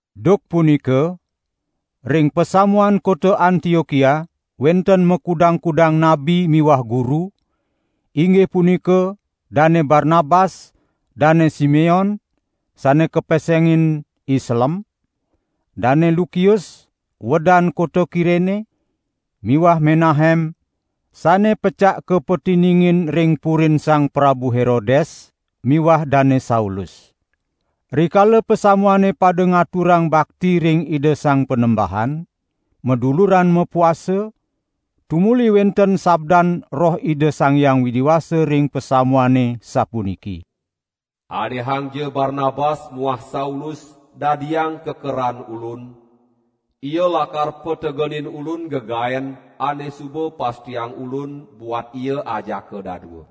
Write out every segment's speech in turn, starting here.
Duk punika ring pasamuan kota Antiokia wenten makudang-kudang nabi miwah guru, inggih punika Dane Barnabas, Dane Simeon (sane kapesengin I Selem), Dane Lukius (uedan kota Kirene) miwah Menahem (sane pecak kapatiningin ring purin Sang Prabu Herodes) miwah Dane Saulus. Rikala pasamuane pada ngaturang bakti ring Ida Sang Panembahan, maduluran mapuasa, tumuli wenten sabdan Roh Ida Sang Hyang Widi Wasa ring pasamuane sapuniki: "Anehangja Barnabas muah Saulus dadiang kekeran Ulun, ia lakar pategenin Ulun gegaen ane suba pastiang Ulun buat ia ajaka dadua."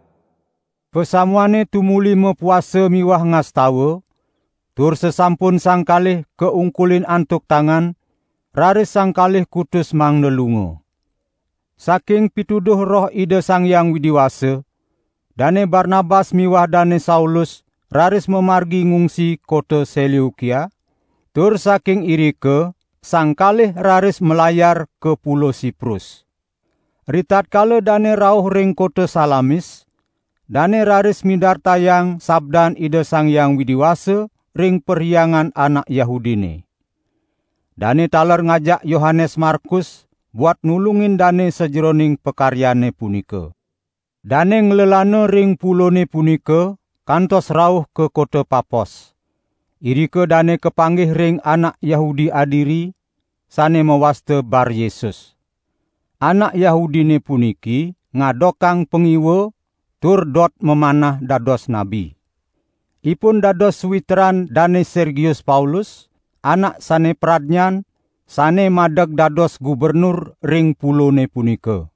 Pasamuane tumuli mapuasa miwah ngastawa, tur sasampun sang kalih kaungkulin antuk tangan, raris sang kalih kutus mangda lunga. Saking pituduh Roh Ida Sang Hyang Widi Wasa, Dane Barnabas miwah Dane Saulus raris mamargi ngungsi kota Seleukia, tur saking irika sang kalih raris malayar ka Pulo Siprus. Ritatkala dane rauh ring kota Salamis, dane raris midartayang sabdan Ida Sang Hyang Widi Wasa ring perhyangan anak Yahudine. Dane taler ngajak Yohanes Markus buat nulungin dane sajeroning pakaryane punika. Dane nglelana ring pulone punika kantos rauh ka kota Papos. Irika dane kapanggih ring anak Yahudi adiri, sane mawasta Baryesus. Anak Yahudine puniki ngadokang pangiwa tur dot mamanah dados nabi. Ipun dados sawitran Dane Sergius Paulus, anak sane pradnyan, sane madeg dados gubernur ring pulone punika.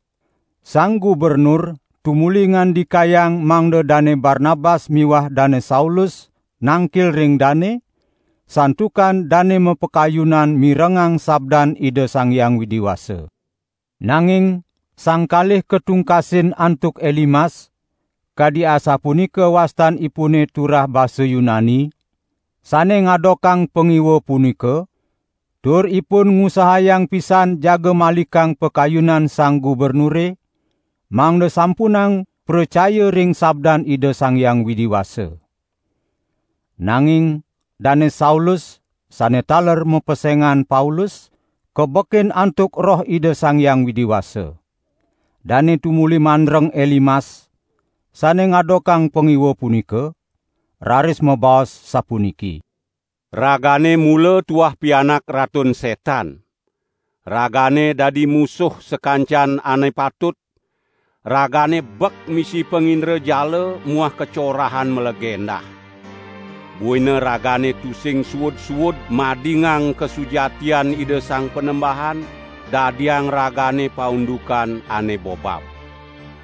Sang gubernur tumuli ngandikayang mangda Dane Barnabas miwah Dane Saulus nangkil ring dane, santukan dane mapakayunan mirengang sabdan Ida Sang Hyang Widi Wasa. Nanging sang kalih katungkasin antuk Elimas, (kadi asapunika wastanipune turah basa Yunani) sane ngadokang pangiwa punika, tur ipun ngusahayang pisan jaga malikang pakayunan sang gubernure mangda sampunang pracaya ring sabdan Ida Sang Hyang Widi Wasa. Nanging Dane Saulus sane taler mapesengan Paulus, kabekin antuk Roh Ida Sang Hyang Widi Wasa. Dane tumuli mandreng Elimas, sane ngadokang pangiwa punika, raris mabaos sapuniki: "Ragane mula tuah pianak Ratun Setan! Ragane dadi musuh sakancan ane patut, ragane bek misi pangindrajala muah kacorahan mlagendah. Buina ragane tusing suud-suud madingang kasujatian Ida Sang Panembahan dadiang ragane paundukan ane bobab.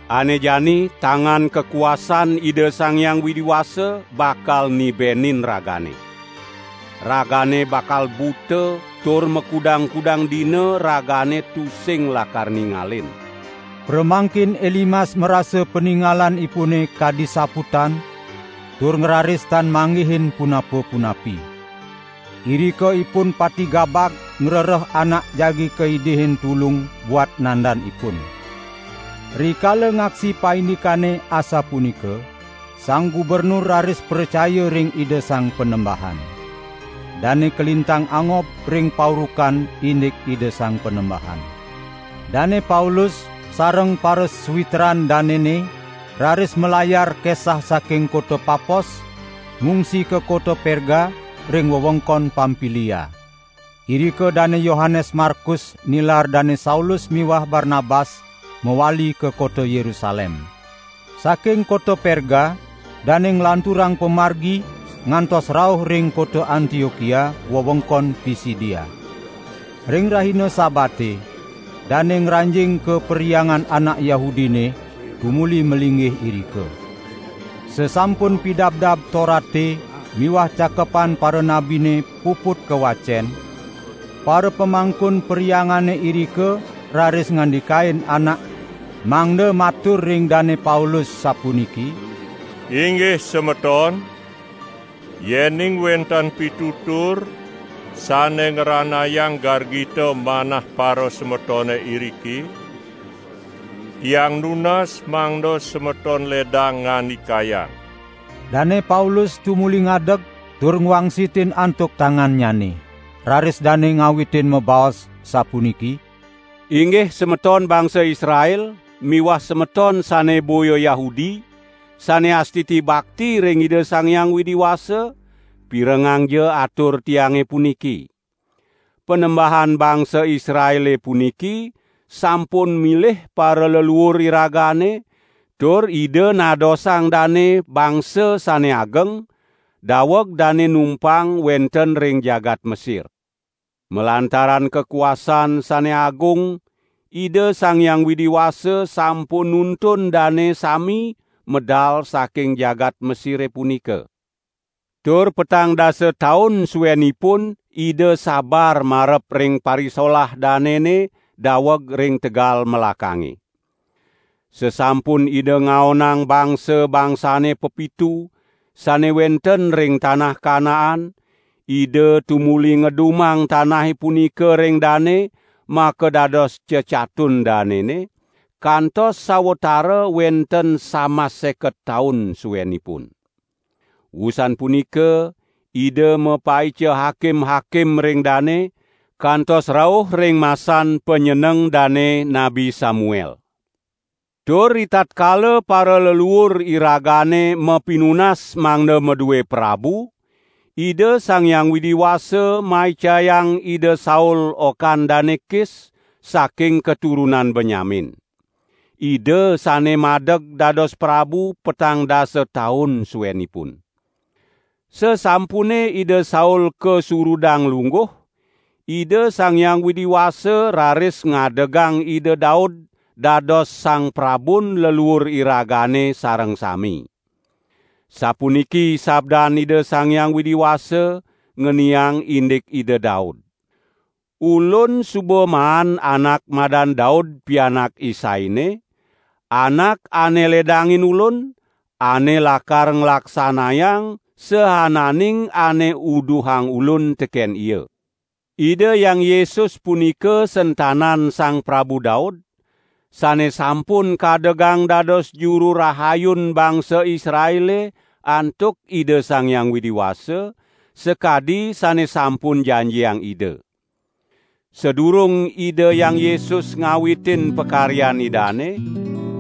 Ane jani tangan kakuasaan Ida Sang Hyang Widi Wasa bakal nibenin ragane. Ragane bakal buta tur makudang-kudang dina ragane tusing lakar ningalin." Pramangkin Elimas marasa paningalanipune kadi saputan tur ngraris tan manggihin punapa-punapi. Irika ipun pati gabag ngrereh anak jagi kaidihin tulung buat nandan ipun. Rikala ngaksi paindikane asapunika, sang gubernur raris pracaya ring Ida Sang Panembahan. Dane kalintang angob ring paurukan indik Ida Sang Panembahan. Dane Paulus sareng parasawitran danene raris malayar kesah saking kota Papos ngungsi ka kota Perga ring wewengkon Pampilia. Irika Dane Yohanes Markus nilar Dane Saulus miwah Barnabas mawali ka kota Yerusalem. Saking kota Perga dane nglanturang pamargi ngantos rauh ring kota Antiokia wewengkon Pisidia. Ring rahina Sabate dane ngranjing ka perhyangan anak Yahudine tumuli malinggih irika. Sasampun Pidabdab Torate miwah Cakepan Paranabine puput kawacen, parapamangkun perhyangane irika raris ngandikain anak mangda matur ring Dane Paulus sapuniki: "Inggih semeton, yening wenten pitutur sane ngranayang gargita manah parasemetone iriki, tiang nunas mangda semeton ledang ngandikayang." Dane Paulus tumuli ngadeg tur ngwangsitin antuk tangannyane. Raris dane ngawitin mabaos, sapuniki: "Inggih semeton bangsa Israel miwah semeton sane boya Yahudi sane astiti bakti ring Ida Sang Hyang Widi Wasa, pirengangja atur tiange puniki! Panembahan bangsa Israele puniki sampun milih paraleluur iragane, tur Ida nadosang dane bangsa sane ageng daweg dane numpang wenten ring jagat Mesir. Malantaran kakuasaan sane agung Ida Sang Hyang Widi Wasa sampun nuntun dane sami medal saking jagat Mesire punika. Tur petang dasa taun suenipun Ida sabar marep ring parisolah danene daweg ring tegal melakange. Sasampun Ida ngaonang bangsa-bangsane pepitu sane wenten ring tanah Kanaan, Ida tumuli ngedumang tanahe punika ring dane, makadados cecatun danene, kantos sawatara wenten samas seket taun suenipun. Wusan punika Ida mapaica hakim-hakim ring dane, kantos rauh ring masan panyeneng dane Nabi Samuel. Tur ritatkala paraleluur iragane mapinunas mangda madue prabu, Ida Sang Hyang Widi Wasa maicayang Ida Saul okan Dane Kis, saking katurunan Benyamin. Ida sane madeg dados prabu petang dasa taun suenipun. Sasampune Ida Saul kasurudang lungguh, Ida Sang Hyang Widi Wasa raris ngadegang Ida Daud dados sang prabun leluur iragane sareng sami. Sapuniki sabdan Ida Sang Hyang Widi Wasa, ngeniang indik Ida Daud: 'Ulun suba maan anak madan Daud pianak Isaine, anak ane ledangin Ulun, ane lakar nglaksanayang saananing ane uduhang Ulun teken ia.' Ida Hyang Yesus punika sentanan Sang Prabu Daud, sane sampun kadegang dados Juru Rahayun bangsa Israele antuk Ida Sang Hyang Widi Wasa, sakadi sane sampun janjiang Ida. Sadurung Ida Hyang Yesus ngawitin pakaryan Idane,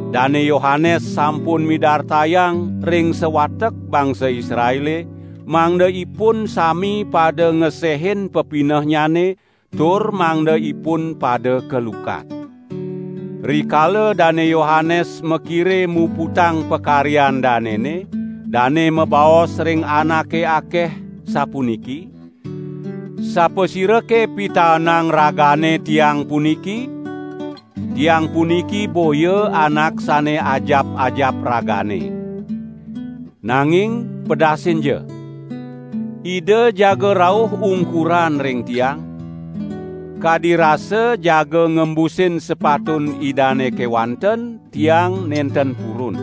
Dane Yohanes sampun midartayang ring sawatek bangsa Israele, mangda ipun sami pada ngesehin pepinehnyane, tur mangda ipun pada kalukat. Rikala Dane Yohanes makire muputang pakaryan danene, dane mabaos ring anake akeh, sapuniki: 'Sapasirake pitaenang ragane tiang puniki? Tiang puniki boya anak sane ajap-ajap ragane. Nanging pedasinja! Ida jaga rauh ungkuran ring tiang; kadi rasa jaga ngembusin sepatun Idane kewanten tiang nenten purun.'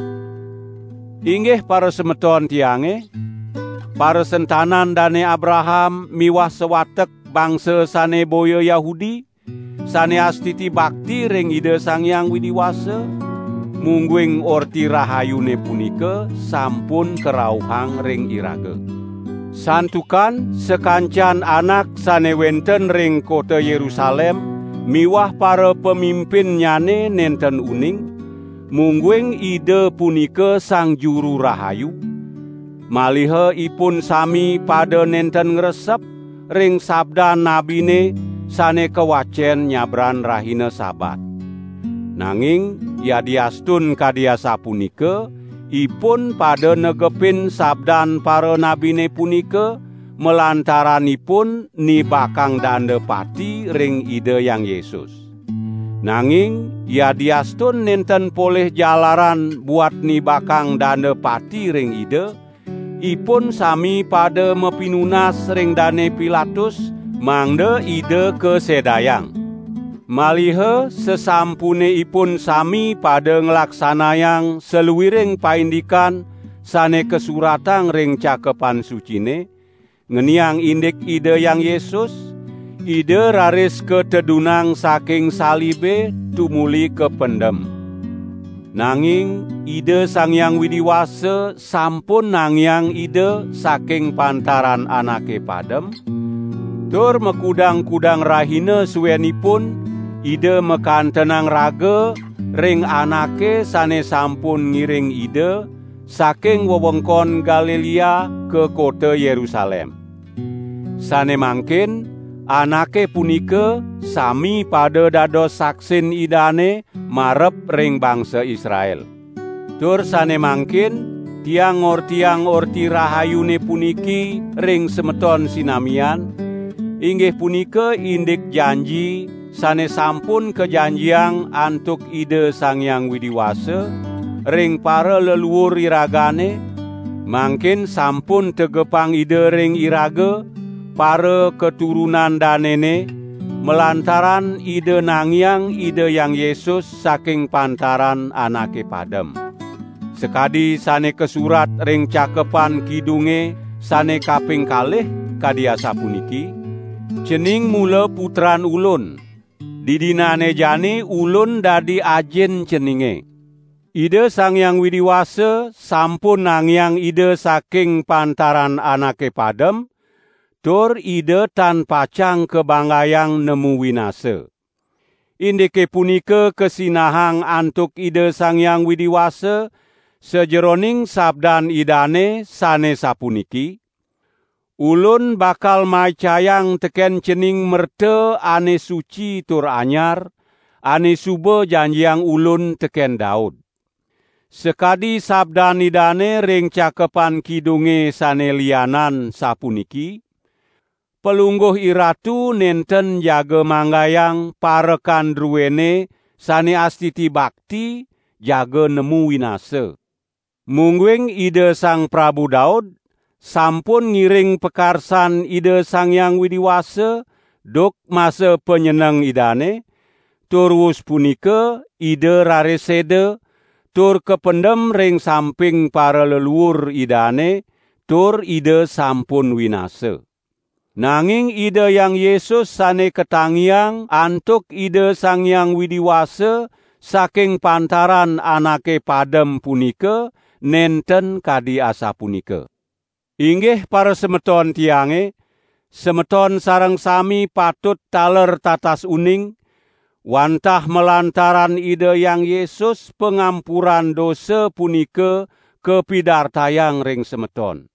Inggih parasemeton tiange, parasentanan Dane Abraham miwah sawatek bangsa sane boya Yahudi, sane astiti bakti ring Ida Sang Hyang Widi Wasa, mungguing Orti Rahayune punika sampun karauhang ring iraga. Santukan sakancan anak sane wenten ring kota Yerusalem miwah parapamimpinnyane nenten uning, mungguing Ida punika Sang Juru Rahayu, maliha ipun sami pada nenten ngresep ring sabdan nabine sane kawacen nyabran rahina Sabat. Nanging yadiastun kadi asapunika, ipun pada negepin sabdan paranabine punika, malantaran ipun nibakang danda pati ring Ida Hyang Yesus. Nanging yadiastun nenten polih jalaran buat nibakang danda pati ring Ida, ipun sami pada mapinunas ring Dane Pilatus mangda Ida kasedayang. Maliha sasampune ipun sami pada nglaksanayang saluiring paindikan sane kasuratang ring Cakepan Sucine, ngeniang indik Ida Hyang Yesus, Ida raris katedunang saking salibe tumuli kapendem. Nanging Ida Sang Hyang Widi Wasa sampun nangiang Ida saking pantaran anake padem, tur makudang-kudang rahina suenipun Ida makantenang raga ring anake sane sampun ngiring Ida saking wewengkon Galilea ka kota Yerusalem. Sane mangkin anake punika sami pada dados saksin Idane marep ring bangsa Israel. Tur sane mangkin tiang ngortiang Orti Rahayune puniki ring semeton sinamian, inggih punika indik janji sane sampun kajanjiang antuk Ida Sang Hyang Widi Wasa, ring paraleluur iragane, mangkin sampun tegepang Ida ring iraga, parakaturunan danene, malantaran Ida nangiang Ida Hyang Yesus saking pantaran anake padem. Sakadi sane kasurat ring Cakepan Kidunge sane kaping kalih, kadi asapuniki: Cening mula Putran Ulun. Didinane jani Ulun dadi Ajin ceninge.' Ida Sang Hyang Widi Wasa sampun nangiang Ida saking pantaran anake padem tur Ida tan pacang kabanggayang nemu winasa. Indike punika kasinahang antuk Ida Sang Hyang Widi Wasa, sajeroning sabdan Idane sane sapuniki: Ulun bakal maicayang teken cening merta ane suci tur anyar, ane suba janjiang Ulun teken Daud.' Sakadi sabdan Idane ring Cakepan Kidunge sane lianan, sapuniki: Palungguh IRatu nenten jaga manggayang parekan druene sane astiti bakti jaga nemu winasa.' Mungguing Ida Sang Prabu Daud sampun ngiring pakarsan Ida Sang Hyang Widi Wasa duk masa panyeneng idane, tur wus punika ida raris seda, tur kapendem ring samping paraleluur idane, tur ida sampun winasa. Nanging Ida Hyang Yesus sane katangiang antuk Ida Sang Hyang Widi Wasa saking pantaran anake padem punika nenten kadi asapunika. Inggih parasemeton tiange, semeton sareng sami patut taler tatas uning, wantah malantaran Ida Hyang Yesus pangampuran dosa punika kapidartayang ring semeton.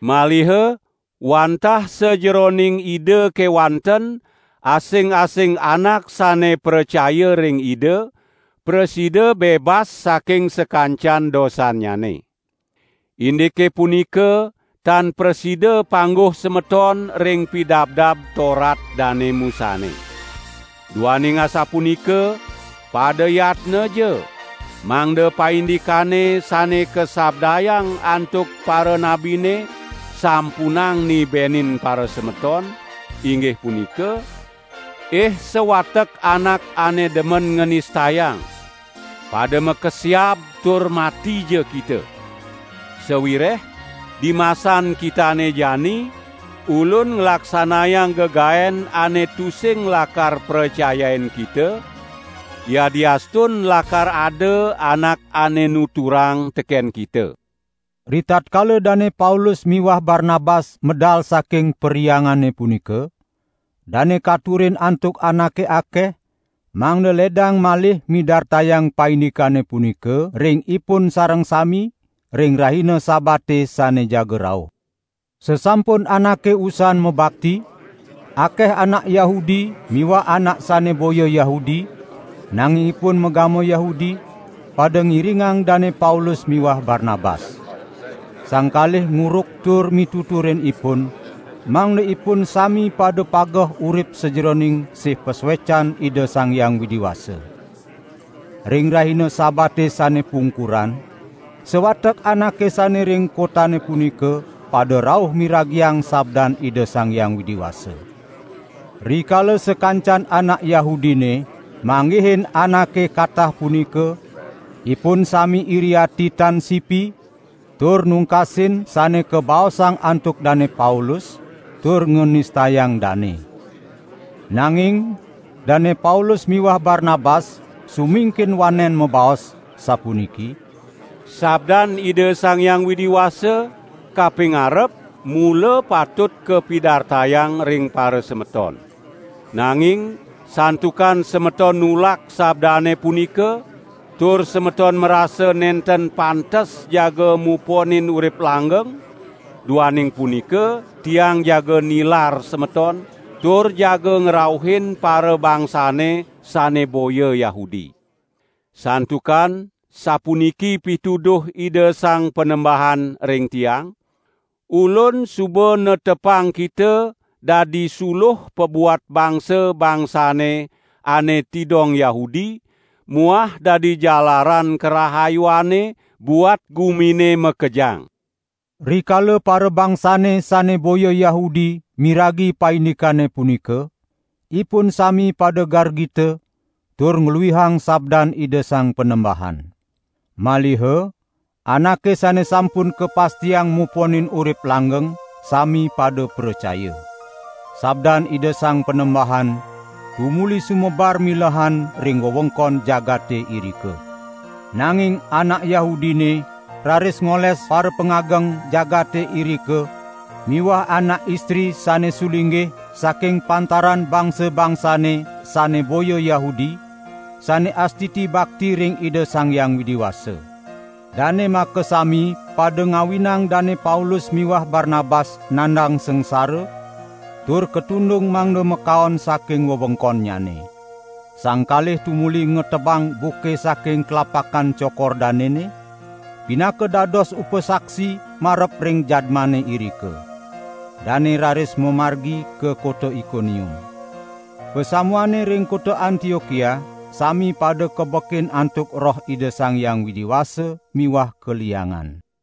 Maliha wantah sajeroning Ida kewanten asing-asing anak sane pracaya ring Ida, prasida bebas saking sakancan dosannyane. Indike punika tan prasida pangguh semeton ring Pidabdab Torat Dane Musane. Duaning asapunika, pada yatnaja, mangda paindikane sane kasabdayang antuk paranabine sampunang nibenin parasemeton, inggih punika: 'Ih sawatek anak ane demen nganistayang! Pada makesiab tur matija kita. Sawireh, dimasan kitane jani, Ulun nglaksanayang gegaen ane tusing lakar pracayain kita, yadiastun lakar ada anak ane nuturang teken kita.' " Ritatkala Dane Paulus miwah Barnabas medal saking perhyangane punika, dane katurin antuk anake akeh, mangda ledang malih midartayang paindikane punika ring ipun sareng sami ring rahina Sabate sane jaga rauh. Sasampun anake usan mabakti, akeh anak Yahudi miwah anak sane boya Yahudi, nanging ipun magama Yahudi, pada ngiringang Dane Paulus miwah Barnabas. Sang kalih nguruk tur mituturin ipun, mangda ipun sami pada pageh urip sajeroning sih pasuecan Ida Sang Hyang Widi Wasa. Ring rahina Sabate sane pungkuran, sawatek anake sane ring kotane punika pada rauh miragiang sabdan Ida Sang Hyang Widi Wasa. Rikala sakancan anak Yahudine manggihin anake katah punika, ipun sami iri ati tan sipi, tur nungkasin sane kabaosang antuk Dane Paulus tur nganistayang dane. Nanging Dane Paulus miwah Barnabas sumingkin wanen mabaos, sapuniki: "Sabdan Ida Sang Hyang Widi Wasa kapingarep mula patut kapidartayang ring parasemeton. Nanging santukan semeton nulak sabdane punika, tur semeton marasa nenten pantes jaga muponin urip langgeng, duaning punika tiang jaga nilar semeton, tur jaga ngrauhin parabangsane sane boya Yahudi. Santukan sapuniki pituduh Ida Sang Panembahan ring tiang: Ulun suba netepang kita dadi suluh pabuat bangsa-bangsane ane tidong Yahudi muah dadi jalaran karahayuane buat gumine makejang.' " Rikala parabangsane sane boya Yahudi miragi paindikane punika, ipun sami pada gargita tur ngluihang sabdan Ida Sang Panembahan. Maliha anake sane sampun kapastiang muponin urip langgeng, sami pada pracaya. Sabdan Ida Sang Panembahan tumuli sumebar milehan ring wewengkon jagate irika. Nanging anak Yahudine raris ngoles parapangageng jagate irika miwah anak istri sane sulinggih saking pantaran bangsa-bangsane sane boya Yahudi, sane astiti bakti ring Ida Sang Hyang Widi Wasa. Dane makasami pada ngawinang Dane Paulus miwah Barnabas nandang sangsara, tur katundung mangda makaon saking wewengkonnyane. Sang kalih tumuli ngetebang buke saking tlapakan cokor danene, pinaka dados upasaksi marep ring jadmane irika. Dane raris mamargi ka kota Ikonium. Pasamuane ring kota Antiokia sami pada kabekin antuk Roh Ida Sang Hyang Widi Wasa miwah kaliangan.